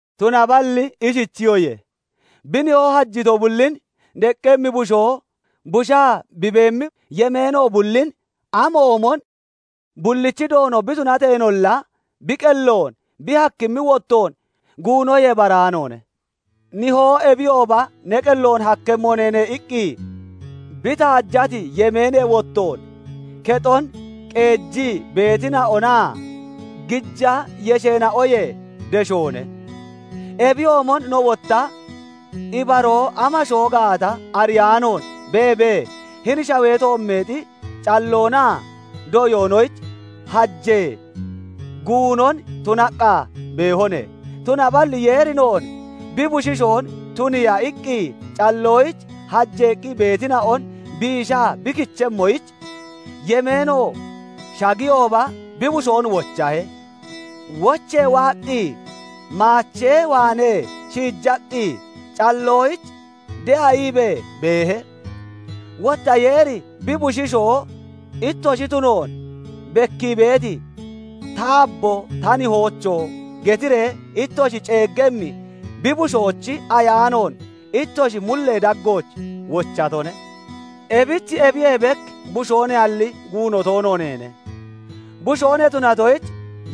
Tunaballi ishichiyoye; bi nihoo hajito bullin deqqemmi bushoo busha bi beemmi yemeeno bullin amoomon bullichi doono bi tunateenolla, bi qelloon bi hakkimmi wottoon guunoyee baraanoone. Nihoo "Ebiyooba ne qelloon hakkemmo neene" iqqi bi taajati yemeenee wottoon kexon qeejii beetina'onaa gija yesheena'oyee deshoone. Ebiyoomon no wotta ibaroo amashoo gaata ariyaanoon beebee, hini shawee toommeexi calloonaa doyoonoyich hajee, guunon tunaqqa beehone. Tunaballi Yeeri noon bi bushiishoon tuniiya iqqi calloyich hajeeqqi beetina'on biisha bi kichemmoyich, yemeeno shaggiyooba bi Bushoon wochahe; wochee waaqqi maachee waanee shiijaqqi calloyich de'a iibee beehe. Wotta Yeeri bi bushiishoo ittoshi tunoon bekkii beeti, "Taabbo ta Nihoocho!" getiree ittoshi ceeggemmi bi Bushoochi Ayaanoon ittoshi mullee daggooch wochatone. Ebich ebiyee bek bushoo neyalli guuno toono neene; bushoo ne tunatoyich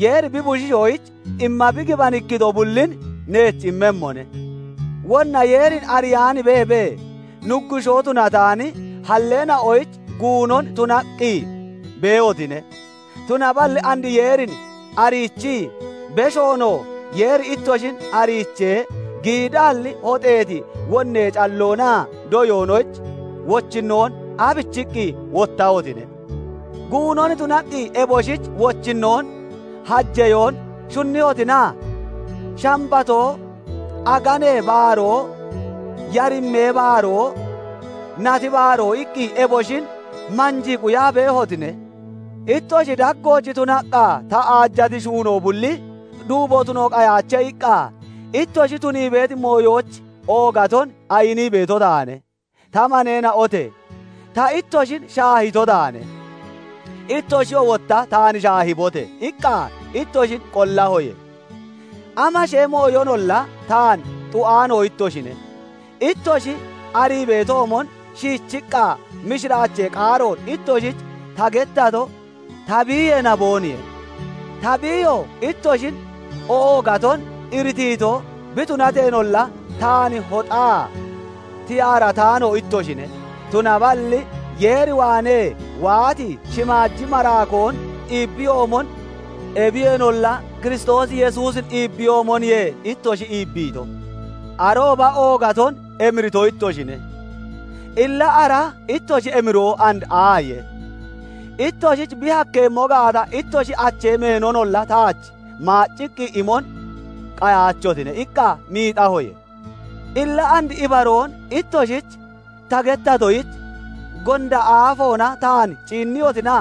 Yeeri bi bushiishoyich imma bi gibanikkito bullin neech immemmone. Wonna Yeerin ariyaan beebee, nuggushoo tunataani halleena'oyich guunon tunaqqi beehotine. Tunaballi and Yeerin ariichii, beshoonoo Yeeri ittoshin ariichee, giidaalli hoxeeti wonnee calloonaa doyoonooch wochinnoon aabichiqqi wottahotine? Guunon tunaqqi eboshich wochinnoon hajeyoon shunniyotina? Shambatoo, aganee baaroo, yarimmee baaroo, nati baaroo iqqi eboshin manjii quyaa beehotine. "Ittoshi daggooch tunaqqa ta aajati shuunoo bulli duubo tuno qayaache" iqqa ittoshi tunii beeti mooyoyich oogaton ayinii beeto taane. Ta maneena'ote! "Ta ittoshin shaahito taane; ittoshiyoo wotta taan shaahibote!" iqqa ittoshin qollahoye. Amashee mooyonolla taan xu'aano ittoshine. Ittoshi arii beetoomon, shiichiqqa mishiraachee qaaroon ittoshich ta gettato ta biiyee naboonaniye. Ta biiyo ittoshin oogaton iritiito bi tunateenolla, taan hoxaa tiyaarataano ittoshine; tunaballi Yeer waanee waati shimaaji maraakoon iibbiyoomon, ebiyeenolla Kiristoos Yesuusin iibbiyoomoniye ittoshi iibbiito. Arooba oogaton emirito ittoshine; illa ara ittoshi emiroo and aaye? "Ittoshich bi hakkeemmo gaata, ittoshi achee meenonolla taach maacciqqi imon qayaachotine" iqqa miixahoye. Illa and ibaroon ittoshich ta gettatoyich gonda aafoona taan ciinniyotina?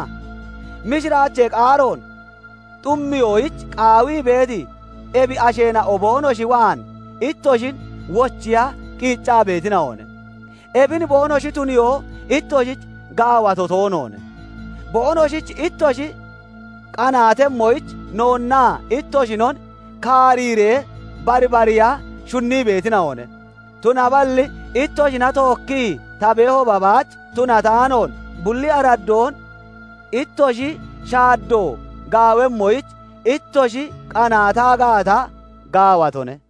Mishiraachee qaaroon xummiyoyich qaawii beeti ebi asheena'o boonoshi waan ittoshin wochiya qiiccaa beetina'one; ebin boonoshi tuniyoo ittoshich gaawato toonoone; boonoshich ittoshi qanaatemmoyich noonnaa ittoshinon kaariiree barbariiya shunnii beetina'one. Tunaballi ittoshina tookkii ta beehooba baach tunataanoon, bulli araddoon ittoshi shaaddo gaawemmoyich ittoshi qanaata gaata, gaawatone.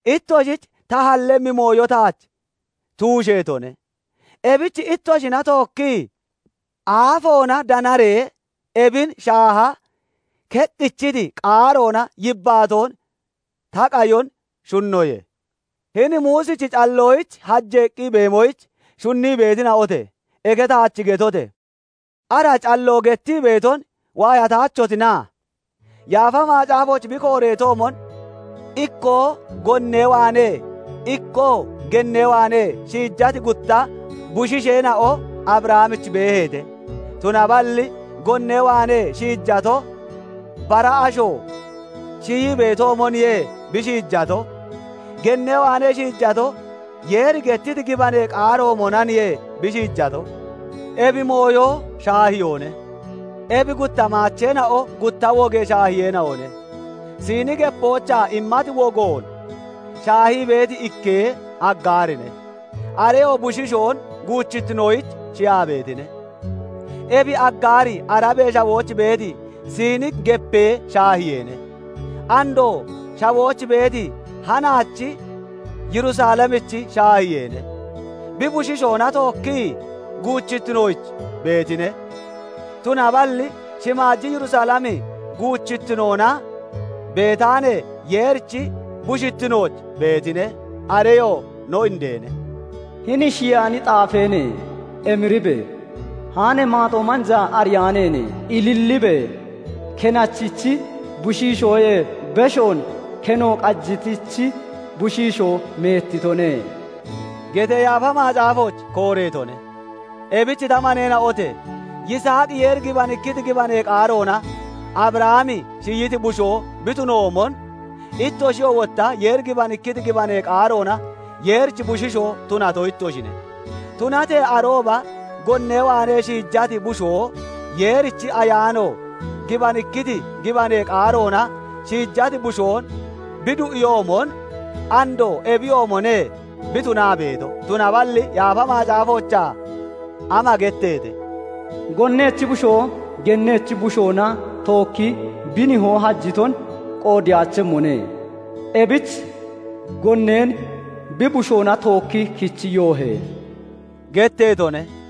Ittoshich ta hallemmi mooyo taach tuusheetone. Ebich ittoshina tookki aafoona danaree ebin shaaha keqqichiti qaaroona yibbaatoon ta qayon shunnoye. Hini Muusichi calloyich hajeeqqi beemoyich shunnii beetina'ote! Eke taach getote! Ara calloo gettii beeton waayataachehotina? Yaafa Macaafooch bi kooreetoomon ikkoo gonnee waanee, ikkoo gennee waanee shiijati gutta bushiisheena'o Abrahamich beeheete. Tunaballi gonnee waanee shiijato bara asho shiyii beetoomoniye bi shiijato; gennee waanee shiijato Yeeri gettiti gibanee qaaroomonaniye bi shiijato. Ebi mooyo shaahiyoone; ebi gutta maacheena'o gutta wogee shaahiyeena'one. Siini Gepoochaa immati wogoon shaahii beeti ikkee Aggaarine. Areyoo bushiishoon guuchittinoyich shiyaa beetine. Ebi Aggaari Arabee Shawooch beeti Siini Gepee shaahiyeene. Andoo shawooch beeti hanaachi Yerusalemichi shaahiyeene. Bi bushiishoona tookkii guuchittinooch beetine. Tunaballi shimaaji Yerusalemi guchittinoona beetaane Yeerichi bushittinooch beetine; areyoo no indeene. "Hini shiyaani xaafeene! Emiribe! Haane maaxoo manjaa ariyaaneene! Ililibe! Kenachichi bushiishoyee beshoon Keno qajitichi bushiishoo meettitone" getee Yaafa Macaafooch kooreetone. Ebich ta maneena'ote! Yisaaqi Yeeri gibanikkiti gibanee qaaroona Abrahami shiyiti bushoo bi tunoomon, ittoshiyoo wotta Yeeri gibanikkiti gibanee qaaroona Yeerichi bushiishoo tunato ittoshine. Tunatee arooba gonnee waanee shiijati bushoo Yeerichi Ayaano gibanikkiti gibanee qaaroona shiijati bushoon bi du'iyoomon, andoo ebiyoomone bi tunaa beeto. Tunaballi Yaafa Macaafoochaa ama getteete? "Gonnechi bushoo gennechi bushoona tookki bi nihoo hajiton qoodeyaachemmone; ebich gonneen bi bushoona tookki kichi yoohe!" getteetone.